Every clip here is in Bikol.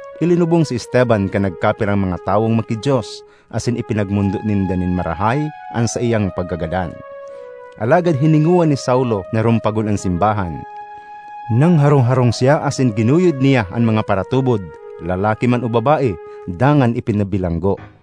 Ilinubong si Esteban kan nagkapirang mga tawong maki-Dios, asin ipinagmondo ninda nin marahay an saiyang pagkagadan. Alagad hiningowa ni Saulo na rumpagon an simbahan; nangharong-harong siya asin ginuyod niya an mga paratubod, lalaki man o babae, dangan ipinabilanggo.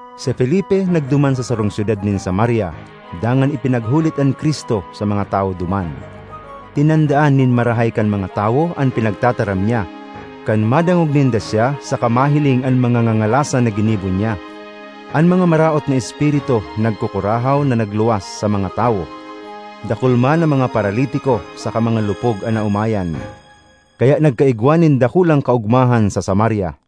Si Felipe nagduman sa sarong syudad nin Samaria, dangan ipinaghulit an Cristo sa mga tawo duman. Tinandaan nin marahay kan mga tawo an pinagtataram niya, kan madangog ninda siya saka mahiling an mga ngangalasan na ginibo niya. An mga maraot na espiritu nagkukurahaw na nagluwas sa mga tawo; dakul man na mga paralitiko saka mga lupog an naomayan. Kaya nagkaigwa nin dakulang kaogmahan sa Samaria.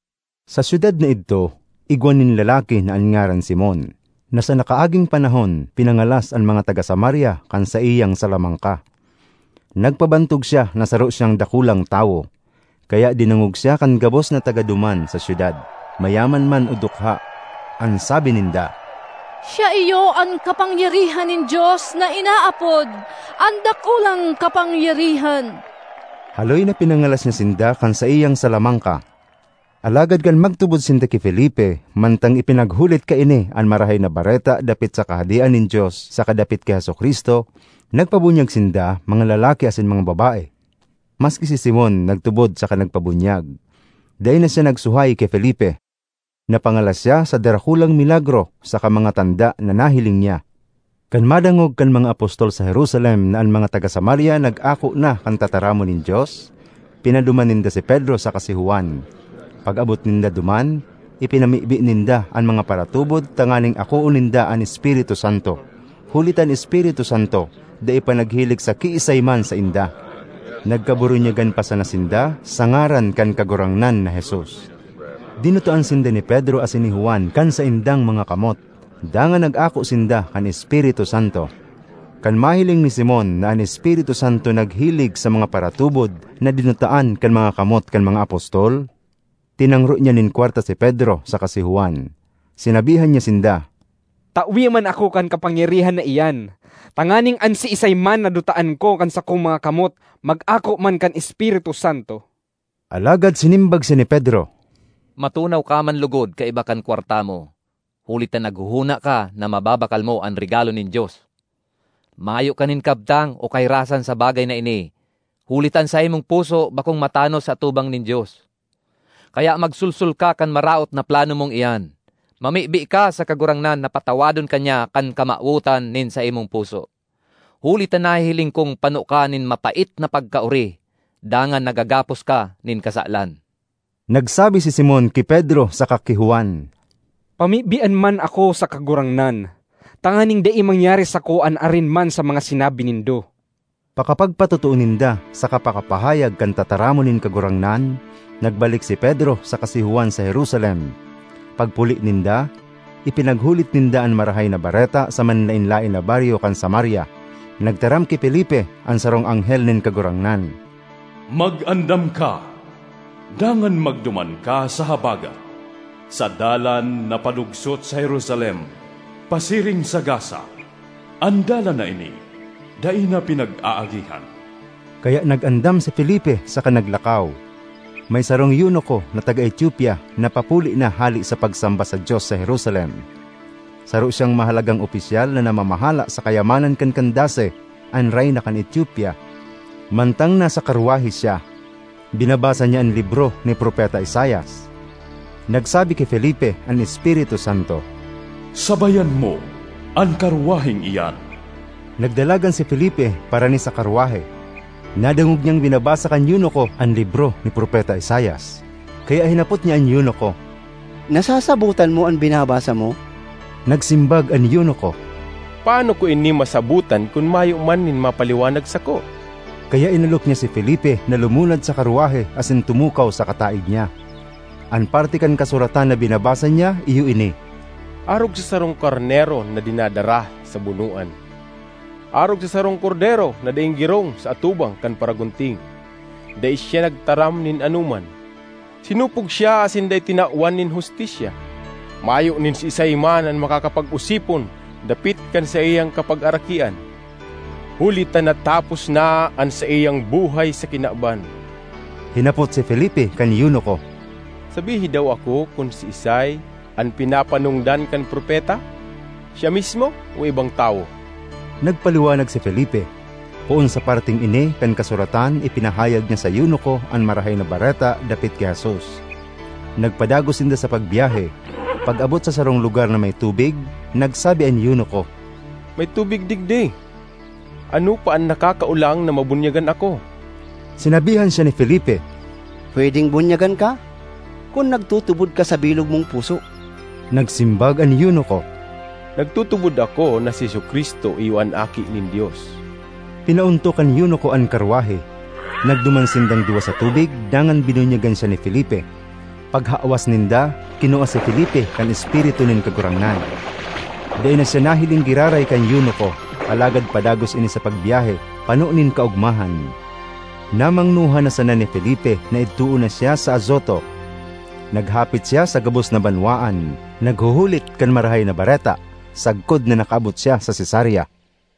Sa syudad na idto igwa nin lalaki na an ngaran Simon, na sa nakaaging panahon pinangalas an mga taga Samaria kan saiyang salamangka. Nagpabantog siya na saro siyang dakulang tawo, kaya dinangog siya kan gabos na taga duman sa syudad, mayaman man o dukha. An sabi ninda, “Siya iyo an kapangyarihan nin Dios na inaapod ‘An Dakulang Kapangyarihan.’” Haloy na pinangalas niya sinda kan saiyang salamangka. Alagad kan magtubod sinda ki Felipe mantang ipinaghulit kaini an Marahay na Bareta dapit sa Kahadean nin Dios saka dapit ki Jesu-Cristo, nagpabunyag sinda, mga lalaki asin mga babae. Maski si Simon nagtubod saka nagpabunyag; dai na siya nagsuhay ki Felipe. Napangalas siya sa darakulang milagro saka mga tanda na nahiling niya. Kan madangog kan mga apostol sa Jerusalem na an mga taga Samaria nag-ako na kan tataramon nin Dios, pinaduman ninda si Pedro saka si Juan. Pag-abot ninda duman, ipinamibi ninda an mga paratubod tanganing akoon ninda an Espiritu Santo, huli ta an Espiritu Santo dai pa naghilig sa kiisay man sainda. Nagkaburunyagan pa sana sinda sa ngaran kan Kagurangnan na Jesus. Dinutaan sinda ni Pedro asin ni Juan kan saindang mga kamot, dangan nag-ako sinda kan Espiritu Santo. Kan mahiling ni Simon na an Espiritu Santo naghilig sa mga paratubod na dinutaan kan mga kamot kan mga apostol, tinangro niya nin kwarta si Pedro saka si Juan. Sinabihan niya sinda, “Tawe man ako kan kapangyarihan na iyan, tanganing an siisay man na dutaan ko kan sakong mga kamot mag-ako man kan Espiritu Santo.” Alagad sinimbag siya ni Pedro, “Matunaw ka man logod kaiba kan kwarta mo, huli ta naghohona ka na mababakal mo an regalo nin Dios! Mayo ka nin kabtang o kahirasan sa bagay na ini, huli ta an saimong puso bakong matanos sa atubang nin Dios. Kaya magsolsol ka kan maraot na plano mong iyan; mamibi ka sa Kagurangnan na patawadon ka niya kan kamawotan nin saimong puso. Huli ta nahihiling kong pano ka nin mapait na pagkaori, dangan nagagapos ka nin kasalan.” Nagsabi si Simon ki Pedro saka ki Juan, “Pamibian man ako sa Kagurangnan, tanganing dai mangyari sako an arin man sa mga sinabi nindo.” Pakapagpatotoo ninda saka pakapahayag kan tataramon nin Kagurangnan, nagbalik si Pedro saka si Juan sa Jerusalem. Pagpuli ninda, ipinaghulit ninda an Marahay na Bareta sa manlaen-laen na baryo kan Samaria. Nagtaram ki Felipe an sarong anghel nin Kagurangnan, “Mag-andam ka dangan magduman ka sa habagat, sa dalan na palugsot sa Jerusalem pasiring sa Gaza.” (An dalan na ini dai na pinag-aagihan.) Kaya nag-andam si Felipe saka naglakaw. May sarong eunuko na taga Etiopia na papuli na hale sa pagsamba sa Dios sa Jerusalem. Saro siyang mahalagang opisyal na namamahala sa kayamanan kan Candace, an reyna kan Etiopia. Mantang nasa karwahe siya, binabasa niya an libro ni Propeta Isaias. Nagsabi ki Felipe an Espiritu Santo, “Sabayan mo an karwaheng iyan.” Nagdalagan si Felipe parani sa karwahe; nadangog niyang binabasa kan eunuko an libro ni Propeta Isaias, kaya hinapot niya an eunuko, “Nasasabotan mo an binabasa mo?” Nagsimbag an eunuko, “Paano ko ini masabotan kun mayo man nin magpaliwanag sako?” Kaya inalok niya si Felipe na lumunad sa karwahe asin tumukaw sa kataed niya. An parte kan kasuratan na binabasa niya iyo ini: “Arog sa sarong karnero na dinadara sa bunoan, arog sa sarong kordero na daing girong sa atubang kan paragunting, dai siya nagtaram nin anoman. Sinupog siya asin dai tinawan nin hustisya. Mayo nin siisay man na makakapag-osipon dapit kan saiyang kapagarakian, huli ta natapos na an saiyang buhay sa kinaban.” Hinapot si Felipe kan eunuko, “Sabihi daw ako kun siisay an pinapanongdan kan propeta? Siya mismo o ibang tawo?” Nagpaliwanag si Felipe; poon sa parteng ini kan kasuratan ipinahayag niya sa eunuko an Marahay na Bareta dapit ki Jesus. Nagpadagos sinda sa pagbyahe; pag-abot sa sarong lugar na may tubig, nagsabi an eunuko, “May tubig digdi; ano pa an nakakaolang na mabunyagan ako?” [Sinabihan siya ni Felipe, “Pwedeng bunyagan ka, kun nagtutubod ka sa bilog mong puso.” Nagsimbag an eunuko, “Nagtutubod ako na si Jesu-Cristo iyo an Aki nin Dios.”] Pinaontok kan eunuko an karwahe; nagduman sindang duwa sa tubig, dangan binunyagan siya ni Felipe. Paghawas ninda, kinua si Felipe kan Espiritu nin Kagurangnan. Dai na siya nahiling giraray kan eunuko, alagad padagos ini sa pagbyahe, pano nin kaogmahan. Namangnohan na sana ni Felipe na idtoon na siya sa Azoto. Naghapit siya sa gabos na banwaan, naghuhulit kan Marahay na Bareta, sagkod na nakaabot siya sa Cesarea.